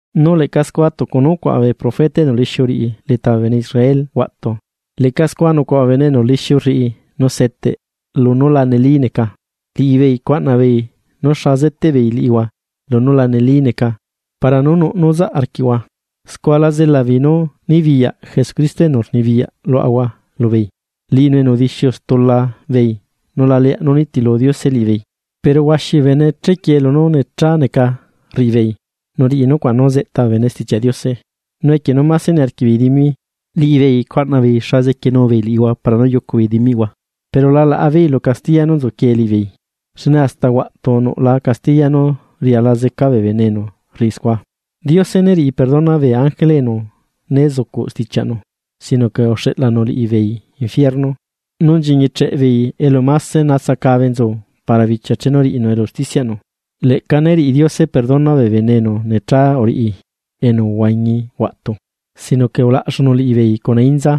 Nu leꞌca scua tucu nú ucuaꞌa bee profeta enu lixiu uriꞌi leta bee bene Israel huaꞌtu. Leꞌca scua nucuaꞌa bee bene enu lixiu rriꞌi nu seteꞌbeei lunú la neli neca. Liꞌibeei cuaꞌna beei nú xa zeteꞌbeei liꞌihua lunú la neli neca para nú nuꞌ nu zaꞌ arquiꞌhua, scua la zela beei nu nibiyaꞌ Jesucristo enu rnibiyaꞌ luaꞌahua lubeei, liꞌinu enu udixiu stula beei nu la leaꞌ nú nitilu Diose liꞌibeei. Pero huaxi bee bene chequie lunú necha neca rriꞌi beei nu riꞌi nucuaꞌ nú zeꞌta bee bene Stichiaꞌ Diose. Nu equie nú máse niarquiꞌ beei dimi, liꞌibeei cuaꞌna beei xa zequienu beei liꞌihua para nu yucu beei dimiꞌhua, pero la laꞌa beei lu castiya nú nzuquie liꞌibeei, xne hasta huaꞌtu nuꞌla castiya nú riala zeca bee bene enu rriꞌi scua. Diose né riꞌi perdona bee ángele enu né zucuꞌ stichiaꞌnu, sino que uxeꞌlanu liꞌibeei ebila, nu nchiñicheꞌbeei elu máse natsacabe nzu para bichia chenu riꞌinu elu usticiaꞌnu. Leꞌca né riꞌi Diose perdona bee bene enu necha uriꞌi enu uhuañi huaꞌtu, sino que ulaꞌxunu liꞌibeei cuna inza,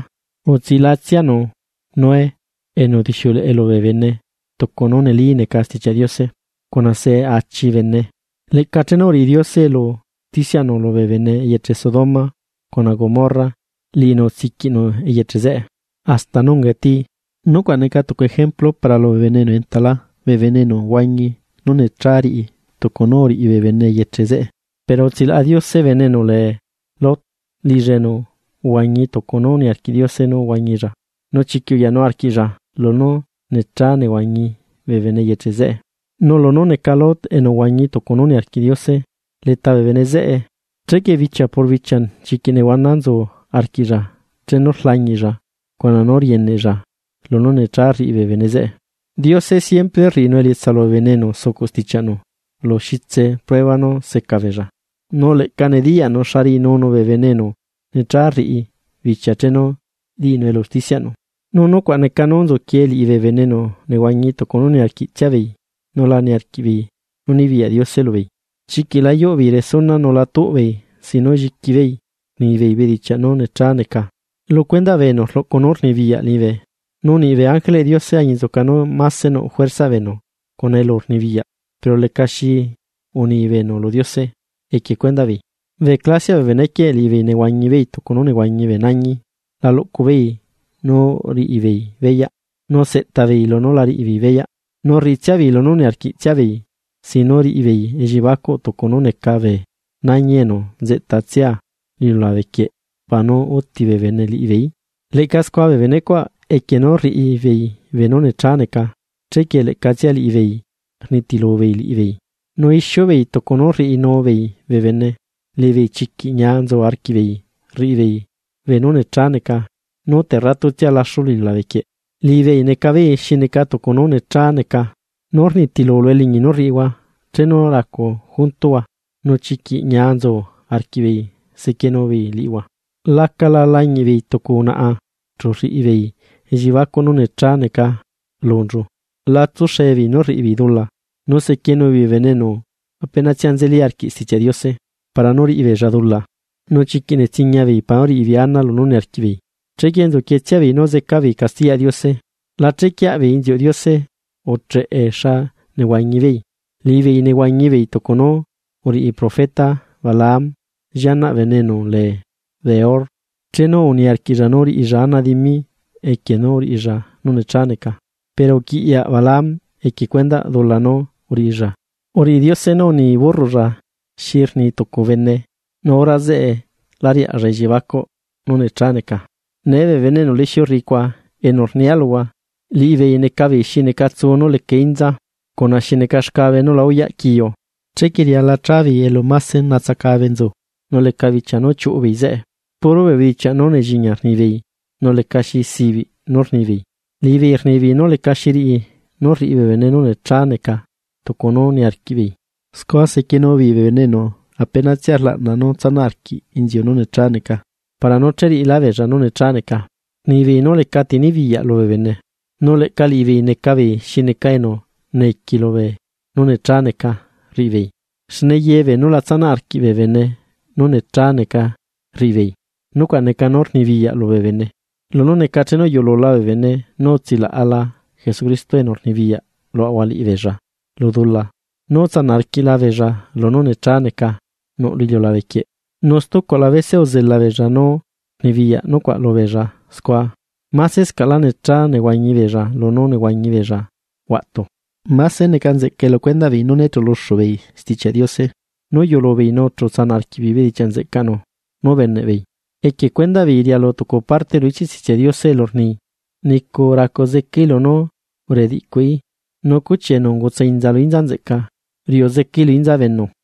utsilaꞌatsianu Noé enu udixiuleꞌe lubee bene tucu nu neli neca Stichiaꞌ Diose cuna se achi bene. Leꞌca chenu uriꞌi Diose elu usticiaꞌnu lubee bene eyeche Sodoma cuna Gomorra, liꞌinu utsiquiꞌnu eyeche zeꞌe hasta nú ungae tii, nucuaꞌ neca tucu ejemplu para lubee bene enu entalá, bee bene enu huañi nu necha riꞌi, tucu nu uriꞌi bee bene bee eyeche zeꞌe. Pero utsilaꞌa Diose bene enu lee Lot, liꞌilla enu uhuañi tucu nú niarquiꞌ Diose nú huañilla, nu chiquiꞌ uyanu arquiꞌlla lunú necha nehuañi bee bene eyeche zeꞌe. Nu lunú neca Lot enu uhuañi tucu nú niarquiꞌ Diose leta bee bene zeꞌe, chequie bichia por bichia chiquiꞌ nehuana nzu arquiꞌlla chenu rlañiꞌlla cuna nú rieneꞌlla lunú necha rriꞌi bee bene zeꞌe. Diose siempre rriꞌi elietsa lubee bene enu sucuꞌ stichiaꞌnu lu xitse prueba nú seca beella, nu leꞌca nediyaꞌnu xa riꞌinunu bee bene enu necha rriꞌi bichia chenu riꞌinu elu usticiaꞌnu. Nu nucuaꞌ neca nu nzuquie liꞌi bee bene enu nehuañi tucu nu niarquiꞌtsia beei nu la niarquiꞌbeei nú nibiyaꞌ Diose lubeei. Chiquiꞌ la yuꞌbeei resuna nu la tuꞌbeei sin nu lliqui beei rnibeei bedichiaꞌ nu necha neca, lu cuendaꞌ bee enu rluꞌcu nú rnibiyaꞌ liñibe, nu niꞌ bee ángeleꞌ Diose añinzuca nú máse nuꞌ juerzaꞌ beenu cuna elurnibiyaꞌ, pero lecaxi uni beenu lu Diose equie cuendaꞌ beei. Bee clasiaꞌ bee benequieꞌ liꞌibeei nehuañi beei tucu nú nehuañi bee nañi, la luꞌcu beei nu riꞌi beei beyaꞌ, nu seꞌta beei lunú la riꞌi beei beyaꞌ, nu rriꞌitsia beei lunú niarquiꞌ tsia beei sin nu riꞌi beei elliebacuꞌ, tucu nú neca bee nañi enu nzeꞌtatsia lu iliulabe quieꞌ para nu úti bee bene liꞌibeeí. Leꞌca scua bee benecuaꞌ equie nu rriꞌi beei beenú necha neca, chequie leꞌcatsia liꞌibeei rnitilu beei liꞌibeei, Nu ixiu beei tucu nu rriꞌinu beei bee bene. Liꞌibeei chiquiꞌ ñia nzu arquiꞌbeei rriꞌi beei beenú necha neca nú terratutsia laxu lu iliulabe quieꞌ, liꞌibeei neca beei xi neca tucu nu necha neca, nú rnitilu lu eliñi nú rriꞌihua chenu racu juntuhua, nu chiquiꞌ ñia nzu arquiꞌbeei sequienubeei liꞌihua. Lacala lañiꞌbeei tucu unaꞌa chu rriꞌibeei elliebacuꞌ nu necha neca lunchu; la tsuxe beei nú rriꞌi beei dula. Nu sequienu beei bee bene enu lleꞌnalá nzeli arquiꞌ Stichiaꞌ Diose, para nu riꞌibeella dula, nu chiquiꞌ netsiña beei para nú riꞌibeei ana lunú niarquiꞌbeei. Chequie nzu quietsia nú zeca beei castiyaꞌ Diose. La chequieaꞌ beei inziuꞌ Diose ucheꞌe xa nehuañibeei. Liꞌibeei nehuañibeei tucu nú uriꞌi profeta Balaam llianaꞌ bene enu lee Beor, chenu niarquiꞌlla nú riꞌilla ana dimi equie nú uriꞌilla nu necha neca. Pero uquiꞌyaꞌ Balaam equie cuendaꞌ dula nú uriꞌilla, uriꞌi Diose nu uni burroꞌlla xi rni tucu bene nu hora zeꞌe lá riaꞌlla elliebacuꞌ nu necha neca. Nee bee bene enu lixiu rriꞌi cuaꞌ enu rnia luhua liꞌibeei neca beei xi neca tsu nú leca inza, cuna xi neca xcabe nu la uyaꞌ quiu, enzeꞌe riala chabeei elu máse natsacabe nzu nu leca bichia nú chiuꞌu beei zeꞌe. Puro bee bedichiaꞌ nú nelliña rnibeei nú lecaxi sibiꞌ, nu liꞌibeei rnibeei nú lecaxi riꞌi nu riꞌi bee bene nu necha neca, scua sequienu beei bee bene enu apenatsia rlaꞌna nú tsanaꞌ arquiꞌ inziu nu necha neca para nu che riꞌilá beella nu necha neca. Rnibeei nu lecati nibiyaꞌ lubee bene, nu leꞌca liꞌibeei neca beei xi neca enu neiqui lubee nu necha neca rriꞌibeei, xne ye beenú la tsanaꞌ arquiꞌbee bene nú necha neca rriꞌi beei, nucuaꞌ neca nú rnibiyaꞌ lubee bene. Lunú necane chenu uyuꞌulula bee bene nu utsilaꞌla Jesucristo enu rnibiyaꞌ luaꞌahua liꞌibeella lu dula nú utsanaꞌ arquiꞌla beella lunú necha neca nuꞌ lu iliulabe quieꞌ, nu stucuaꞌla bese uzela beella nu rnibiyaꞌ nucuaꞌ lubeella, scua masescaꞌlá necha nehuañi beella lunú uhuañi beella huaꞌtu. Máse neca nzeꞌcae lu cuendaꞌ beei nú né chuluxu beei Stichiaꞌ Diose, nu uyulu beeii nu chu utsanaꞌ arquiꞌbeei bedichiaꞌ nzeꞌcaꞌnu nú ubeneꞌbeei. Equie cuendaꞌ beei rialu tucu parte lu ichiꞌ Stichiaꞌ Diose elu rni: “Nicu racu zecaí lunú uridiꞌcuí, nu cuchi enu ungutsa inza lu inza nzeꞌca, riuꞌu zecaí lu inzabenu.”